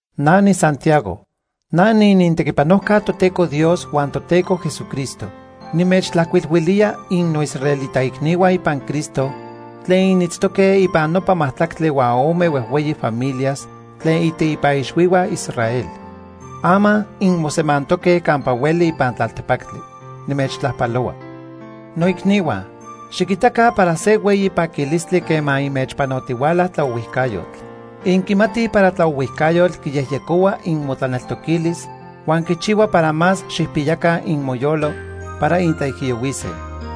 Na niSantiago. Na niinintequipanojca Toteco Dios huan Toteco Jesucristo. Nimechtlajcuilhuilía innoisraelita icnihua ipan Cristo tlen initztoque ipan nopa majtlactli huan ome huejhueyi familias tlen iteipa ixhuihua Israel. Ama inmosemantoque campa hueli ipan tlaltepactli. Nimechtlajpalohua. Noicnihua, xiquitaca para se hueyi paquilistli quema inmechpanotihuala tlaohuijcayotl. Inquimatij para tlaohuijcayotl quiyejyecohua inmotlaneltoquilis huan quichihua para más xijpiyaca inmoyolo para intlaijiyohuise.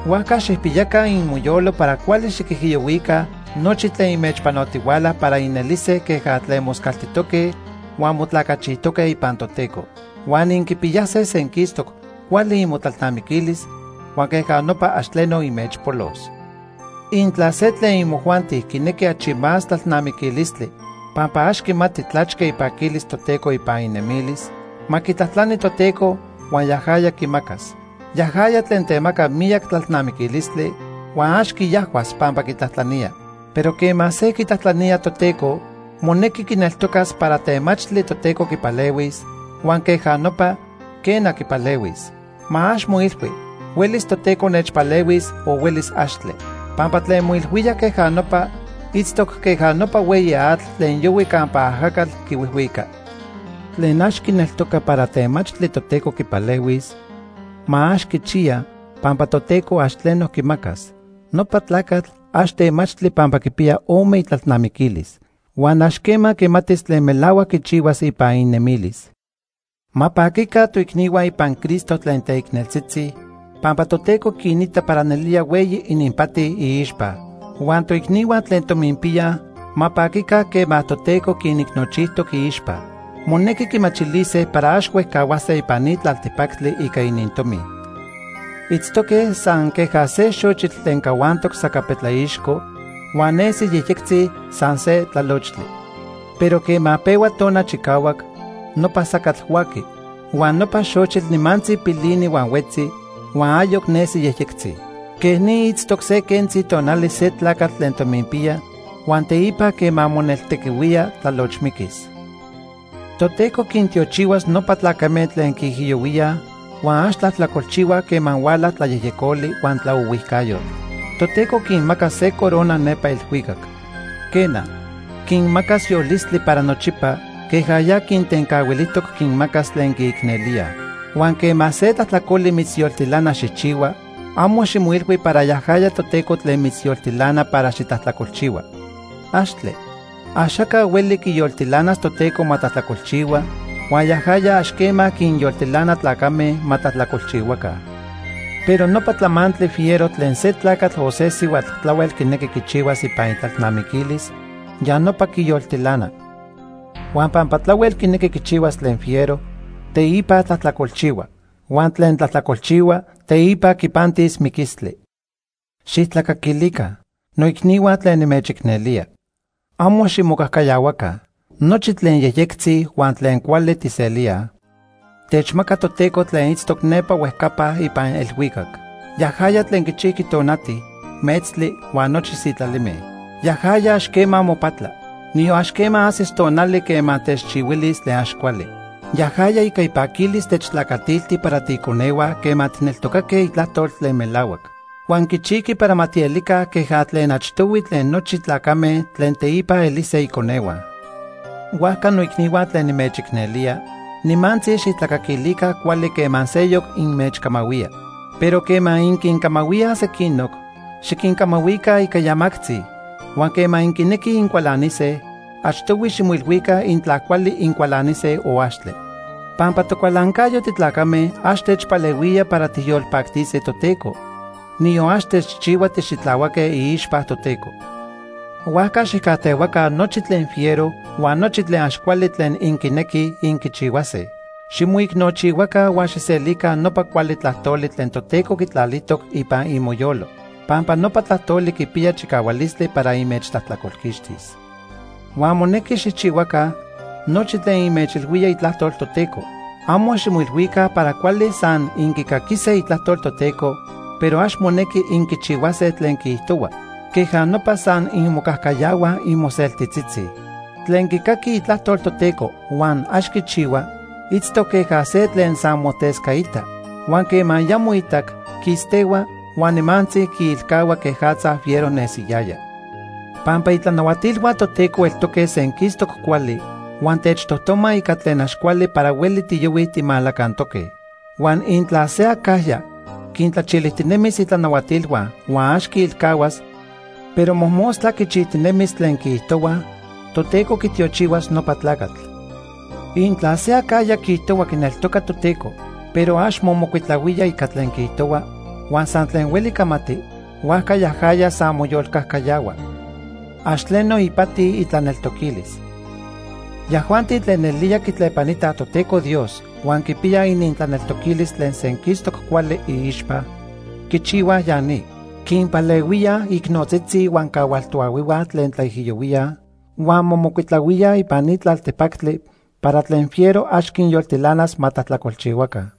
Huajca xijpiyaca inmoyolo para cuali xiquijiyohuica nochi tlen inmechpanotihuala para inelise queja tlen moscaltijtoque huan motlacachijtoque ipan Toteco. Huan inquipiyase senquistoc cuali imotlalnamiquilis huan queja nopa ax tleno inmechpolos. Intla se tlen imojuanti quinequi achi más tlalnamiquilistli pampa ax quimati tlachque ipaquilis Toteco ipan inemilis, ma quitlajtlani Toteco huan yajaya quimacas. Yajaya tlen temaca miyac tlalnamiquilistli, huan ax quiajhuas pampa quitlajtlanía. Pero quema se quitlajtlanía Toteco, monequi quineltocas para temachtli Toteco quipalehuis, huan queja nopa, quena, quipalehuis. Ma ax moilhui: “Huelis Toteco nechpalehuis o huelis axtle.” Pampa tlen moilhuía queja nopa itztoc queja nopa hueyi atl tlen yohui campa ajacatl quihuijhuica. Tlen ax quineltoca para temachtli Toteco quipalehuis, ma ax quichiya, pampa Toteco ax tleno quimacas. Nopa tlacatl ax temachtli pampa quipiya ome itlalnamiquilis, huan ax quema quimatis tlen melahuac quichihuas ipan inemilis. Ma paquica toicnihua ipan Cristo tlen teicneltzitzi pampa Toteco quinita para nelía hueyi ininpati iixpa. Huan toicnihua tlen tominpiyaj ma paquica quema Toteco quinicnochijtoc iixpa. Monequi quimachilise para ax huejcahuase ipan ni tlaltepactli ica inintomi. Itztoque san queja se xochitl tlen cahuantoc sacapetlaixco huan nesi yejyectzi san se tlalochtli. Pero quema pehua tona chicahuac, nopa sacatl huaqui. Huan nopa xochitl nimantzi pilini huan huetzi, huan ayoc nesi yejyectzi. Quej ni itztoc se quentzi tonali se tlacatl tlen tominpiya huan teipa quema moneltequihuía, tlalochmiquis. Toteco quintiochihuas nopa tlacame tlen quiijiyohuíaj huan ax tlajtlacolchihuaj quema huala tlayejyecoli huan tlaohuijcayotl. Toteco quinmacas se corona nepa elhuicac. Quena, quinmacas yolistli para nochipa queja ya quintencahuilijtoc quinmacas tlen quiicnelíaj. Huan quema se tlajtlacoli mitzyoltilana xijchihua, amo ximoilhui para yajaya Toteco tlen mitzyoltilana para xitlajtlacolchihua. ¡Axtle! Axaca hueli quiyoltilanas Toteco ma tlajtlacolchihua huan yajaya ax quema quinyoltilana tlacame ma tlajtlacolchihuaca. Pero nopa tlamantli fiero tlen se tlacatl o se sihuatl tlahuel quinequi quichihuas ipan itlalnamiquilis, ya nopa quiyoltilana. Huan pampa tlahuel quinequi quichihuas tlen fiero, teipa tlajtlacolchihua. Huan tlen tlajtlacolchihua, teipa quipantis miquistli. Xijtlacaquilica, noicnihua tlen nimechicnelía. Amo ximocajcayahuaca. Nochi tlen yejyectzi huan tlen cuali tijselíaj, techmaca Toteco tlen itztoc nepa huejcapa ipan elhuicac. Yajaya tlen quichijqui tonati, metztli huan nochi sitlalime. Yajaya ax quema mopatla. Niyon ax quema ajsis tonali quema techchihuilis tlen ax cuali. Yajaya ica ipaquilis techtlacatilti para tiiconehua quema tijneltocaque itlajtol tlen melahuac. Huan quichijqui para ma tielica queja tlen achtohui tlen nochi tlacame tlen teipa elise iconehua. Huajca noicnihua tlen nimechicnelía, nimantzi xijtlacaquilica cuali quema seyoc inmechcamahuía. Pero quema inquincamahuíaj sequinoc, xiquincamahuica ica yamactzi, huan quema inquinequij incualanise, achtohui ximoilhuica intla cuali incualanise o axtle. Pampa tocualancayo titlacame ax techpalehuía para tijyolpactise Toteco, niyon ax techchihua tixitlahuaque iixpa Toteco. Huajca xijcajtehuaca nochi tlen fiero huan nochi tlen ax cuali tlen inquinequij inquichihuase. Ximoicnochihuaca huan xijselica nopa cuali tlajtoli tlen Toteco quitlalijtoc ipan imoyolo, pampa nopa tlajtoli quipiya chicahualistli para inmechtlajtlacolquixtis. Huan monequi xijchihuaca nochi tlen inmechilhuía itlajtol Toteco. Amo ximoilhuica para cuali san inquicaquise Itlajtol Toteco pero ax monequi inquichihuase tlen quiijtohua. Queja nopa san inmocajcayahuaj inmoseltitzitzi. Tlen quicaqui Itlajtol Toteco huan ax quichihua, itztoc queja se tlen san motescaita, huan quema ya moitac, quistehua, huan nimantzi quiilcahua quejatza fiero nesiyaya. Pampa itlanahuatilhua Toteco eltoque senquistoc cuali huan techtojtoma ica tlen ax cuali para hueli tiyohuij timalacantoque. Huan intla se acajya quintlachilijtinemis itlanahuatilhua huan ax quiilcahuas, pero mojmostla quichijtinemis tlen quiijtohuaj, Toteco quitiochihuas nopa tlacatl. Intla se acajya quiijtohua quineltoca Toteco, pero ax momocuitlahuía ica tlen quiijtohua; huan san tlen hueli camati, huajca yajaya san moyolcajcayahua. Ax tleno ipati itlaneltoquilis. Yajuanti tlen nelía quitlepanitaj Toteco Dios huan quipiyaj inintlaneltoquilis tlen senquistoc cuali iixpa, quichihuaj ya ni: quinpalehuíaj icnotzitzi huan cahual toahuihua tlen tlaijiyohuíaj, huan momocuitlahuíaj ipan ni tlaltepactli para tlen fiero ax quinyoltilanas ma tlajtlacolchihuaca.